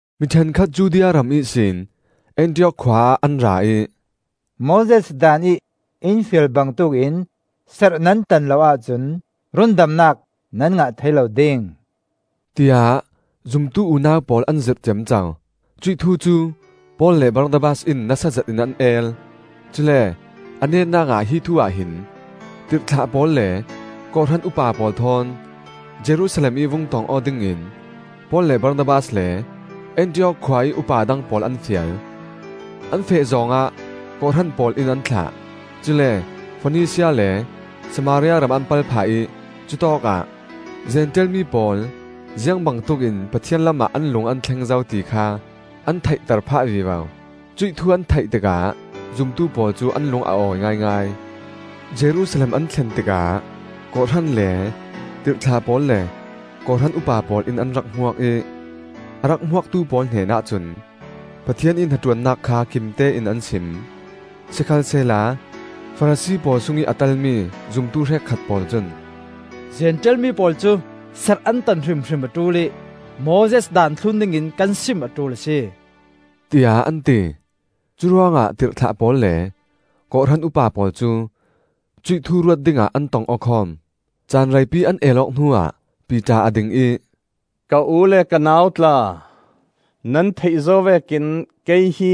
Mi ṭhenkhat Judea ram ihsin Antiok khua ah an ra ih, “Moses Daan ih in fial bangtuk in serh nan tan lo ahcun rundamnak nan ngah thei lo ding,” tiah zumtu unau pawl an zirh ciamco. Cuih thu cu Paul le Barnabas in nasa zetin an el; cule a netnak ah hi thu-ah hin tirhthlah pawl le kawhhran upa pawl thawn Jerusalem ih vung tong aw dingin Paul le Barnabas le Antiok khua ih upa dang pawl an fial. An feh zawng ah kawhhran pawl in an thlah. Cule Fawnisia le Samaria ram an pal phah ih cutawkah Zentail mi pawl ziang bangtuk in Pathian lamah an lung an thleng zo ti kha an theihter phah vivo. Cuih thu an theih tikah zumtu pawl cu an lung a awi ngaingai. Jerusalem an thlen tikah kawhhran le tirhthlah pawl le kawhhran upa pawl in an rak hmuak ih a rak hmuaktu pawl hnenah cun Pathian ih hnaṭuannak kha kimtein an sim. Sikhalsehla Farasi pawl sungih a telmi zumtu hrekkhat pawl cun, “Zentail mi pawl cu serh an tan hrimhrim a ṭul ih Moses Daan thlun dingin kan sim a ṭul a si,” tiah an ti. Curuangah tirhthlah pawl le kawhhran upa pawl cu cuih thu ruat dingah an tong aw khawm. Caan reipi an el awk hnuah Piter a ding ih, “Ka u le ka nau tla, nan theih zo vekin kei hi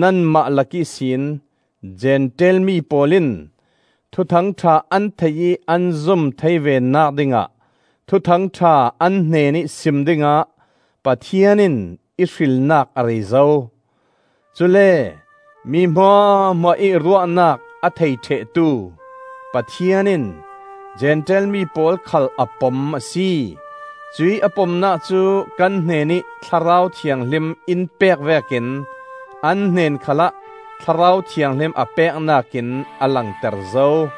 nanmah lak ihsin Zentail mi pawl in Thuthang ṭha an theih ih an zum thei venak dingah Thuthang ṭha an hnenih sim dingah Pathian in i hrilnak a rei zo. Cule mi hmuahhmuah ih ruahnak a thei ṭhehtu Pathian in Zentail mi pawl khal a pom a si; cuih a pomnak cu kan hnenih Thlarau Thianghlim in pek vekin an hnen khalah Thlarau Thianghlim a peknak in a langter zo.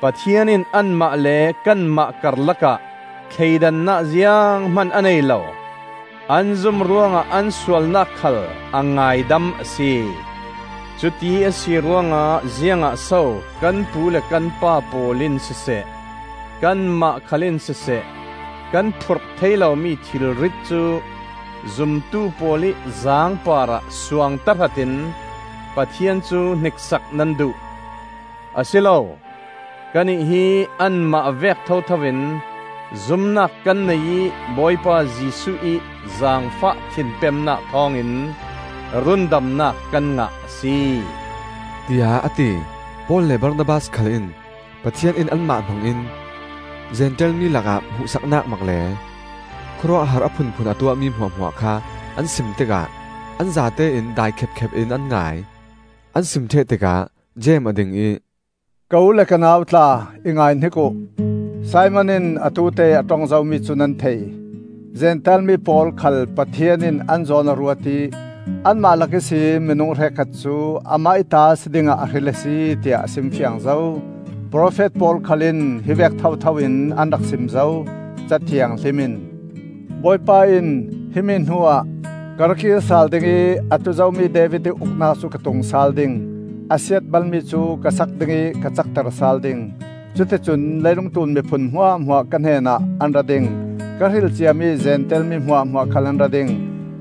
Pathian in anmah le kanmah karlakah thleidannak zianghman a nei lo; an zum ruangah an sualnak khal a ngaidam a si. Cuti a si ruangah ziangah so kan pu le kan pa pawl in siseh, kanmah khal in siseh kan phurh thei lomi thilrit cu zumtu pawl ih zaang parah suang tahratin Pathian cu hniksak nan duh? Asilo! Kannih hi anmah vek thotho in zumnak kan nei ih Bawipa Jesuh ih zaangfah thinpemnak thawngin rundamnak kan ngah a si,” tiah a ti. Paul le Barnabas khal in Pathian in anmah hmangin Zentail mi lakah hmuhsaknak mak le khawruahhar a phunphun a tuahmi hmuahhmuah kha an sim tikah an zatein dai khepkhep in an ngai. An sim ṭheh tikah Jeim a ding ih, “Ka u le ka nau tla, i ngaihnik uh! Simon in atute ih a ṭong zomi cu nan thei. Zentail mi pawl khal Pathian in an zawn a ruat ih anmah lak ihsin minung hrekkhat cu Amah ih ta si dingah a hril a si, tiah a simfiang zo. Profet pawl khal in hivek thothoin an rak sim zo. Ca Thianghlim in: ‘Bawipa in, himi hnuah, Ka ra kir sal ding ih A tlu zomi David ih uknak cu ka tung sal ding. A siatbal mi cu ka sak ding ih ka cakter sal ding. Cuti cun leilung tlun miphun hmuahhmuah ka hnenah an ra ding; Ka hril ciami Zentail mi hmuahhmuah khal an ra ding.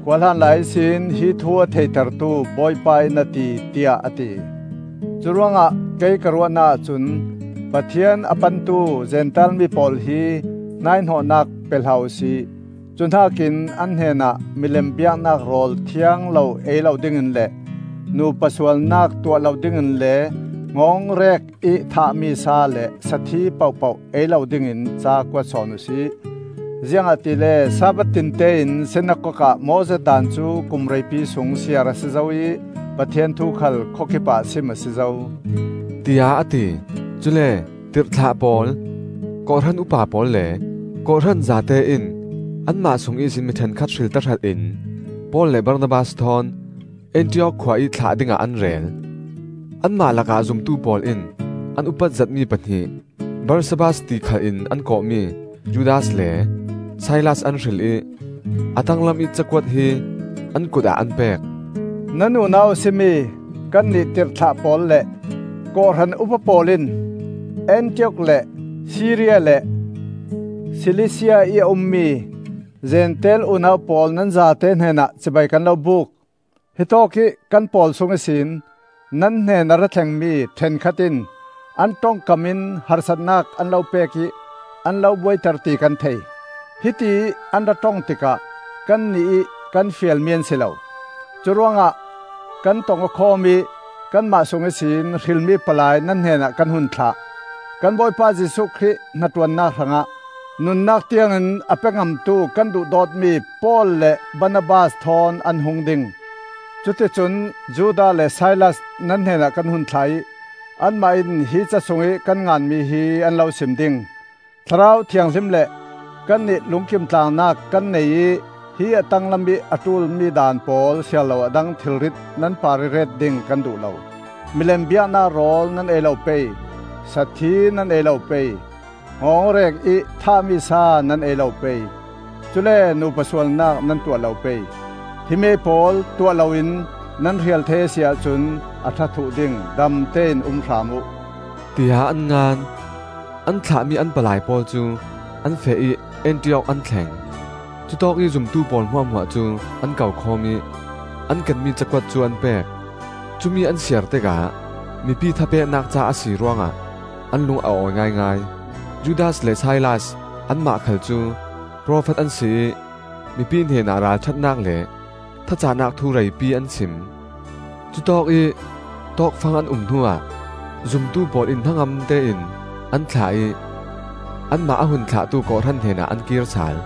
Khuahlan lai ihsin hi thu a theitertu Bawipa in a ti,’ tiah a ti. Curuangah kei ka ruahnak ahcun: Pathian a pantu Zentail mi pawl hi hnaihnawhnak pe hlah uhsi. Cuhnakin an hnenah milem biaknak rawl thiang lo ei lo dingin le nupa sualnak tuah lo dingin le hngawngrek-ih thahmi sa le sathi pohpoh ei lo dingin ca kuat sawn uhsi. Ziangahtile Sabbath tinte in sinakok ah Moses Daan cu kum reipi sung siar a si zo ih Pathian thu khal khawkip ah sim a si zo,” tiah a ti. Cule tirhthlah pawl, kawhhran upa pawl le kawhhran zate in anmah sung ihsin mi ṭhenkhat hril tahratin Paul le Barnabas thawn Antiok khua ih thlah dingah an rel. Anmah lakah zumtu pawl in an upat zetmi pahnih, Barsabbas ti khal in an kawhmi Judas le Silas an hril ih, a tanglamih ca kuat hi an kut ah an pek: “Nan unau a si mi kannih tirhthlah pawl le kawhhran upa pawl in Antiok le Siria le Silisia ih a ummi Zentail unau pawl nan zate hnenah cibai kan lo buk. Hitawkih kan pawl sung ihsin nan hnen a ra thlengmi ṭhenkhat in an ṭongkam in harsatnak an lo pek ih an lo buaiter ti kan thei. Hitiih an ra ṭong tikah kannih ih kan fialmi an si lo. Curuangah kan tong-aw khawm ih kanmah sung ihsin hrilmi palai nan hnenah kan hun thlah. Kan Bawipa Jesuh Khrih hnaṭuannak hrangah nunnak tiangin a pe ngamtu kan duhdawtmi Paul le Barnabas thawn an hung ding. Cuti cun Judas le Silas nan hnenah kan hun thlah ih anmah in hi ca sungih kan nganmi hi an lo sim ding. Thlarau Thianghlim le kannih lungkim tlangnak kan nei ih hi a tanglam ih a ṭulmi daan pawl siarlo a dang thilrit nan parih ret ding kan duh lo: Milem biaknak rawl nan ei lo pei; sathi nan ei lo pei; hngawngrek-ih thahmi sa nan ei lo pei; cule nupa sualnak nan tuah lo pei. Himi pawl tuah loin nan hrial thei a si ahcun a ṭha thluh ding. Damte in um hram uh,” tiah an ngan. An thlahmi an palai pawl cu an feh ih Antiok an thleng. Cutawkih zumtu pawl hmuahhmuah cu an ko khawm ih an kenmi cakuat cu an pek. Cumi an siar tikah mipi thapeknak ca a si ruangah an lung a awi ngaingai. Judas le Silas anmah khal cu profet an si ih mipi hnenah ralṭhatnak le thacahnak thu reipi an sim. Cutawkih tawkfang an um hnuah zumtu pawl in hnangamte in an thlah ih anmah a hun thlahtu kawhhran hnenah an kir sal.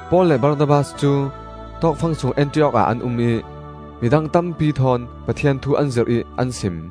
Paul le Barnabas cu tawkfang sung Antiok ah an um ih midang tampi thawn Pathian thu an zirh ih an sim.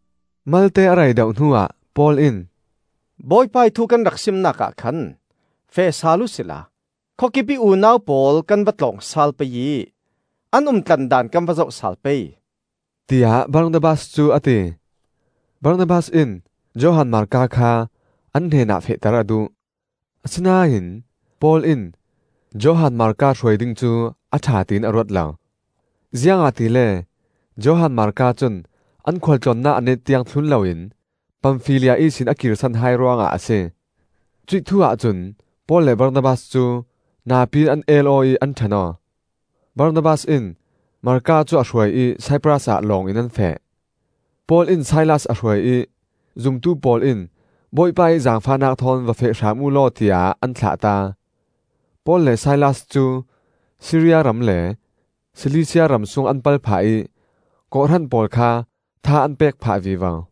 Malte a rei deuh hnuah Paul in, “Bawipa ih thu kan rak simnak ah khan feh sal uhsila khawkip ih unau pawl kan va tlawng sal pei ih an umtlandan kan va zoh sal pei,” tiah Barnabas cu a ti. Barnabas in Johan Marka kha an hnenah fehter a duh. Asinain Paul in Johan Marka hruai ding cu a ṭha tiin a ruat lo, ziangahtile Johan Marka cun an khualtlawnnak a net tiang thlun loin Pamfilia ihsin a kirsan hai ruangah a si. Cuih thu-ah cun Paul le Barnabas cu napi-in an el aw ih an ṭhen aw. Barnabas in Marka cu a hruai ih Saipras ah lawng in an feh. Paul in Silas a hruai ih zumtu pawl in Bawipa ih zaangfahnak thawn va feh hram uhlaw tiah an thlahta. Paul le Silas cu Siria ram le Silisia ram sung an pal phah ih kawhhran pawl kha tha an pek phah vivo.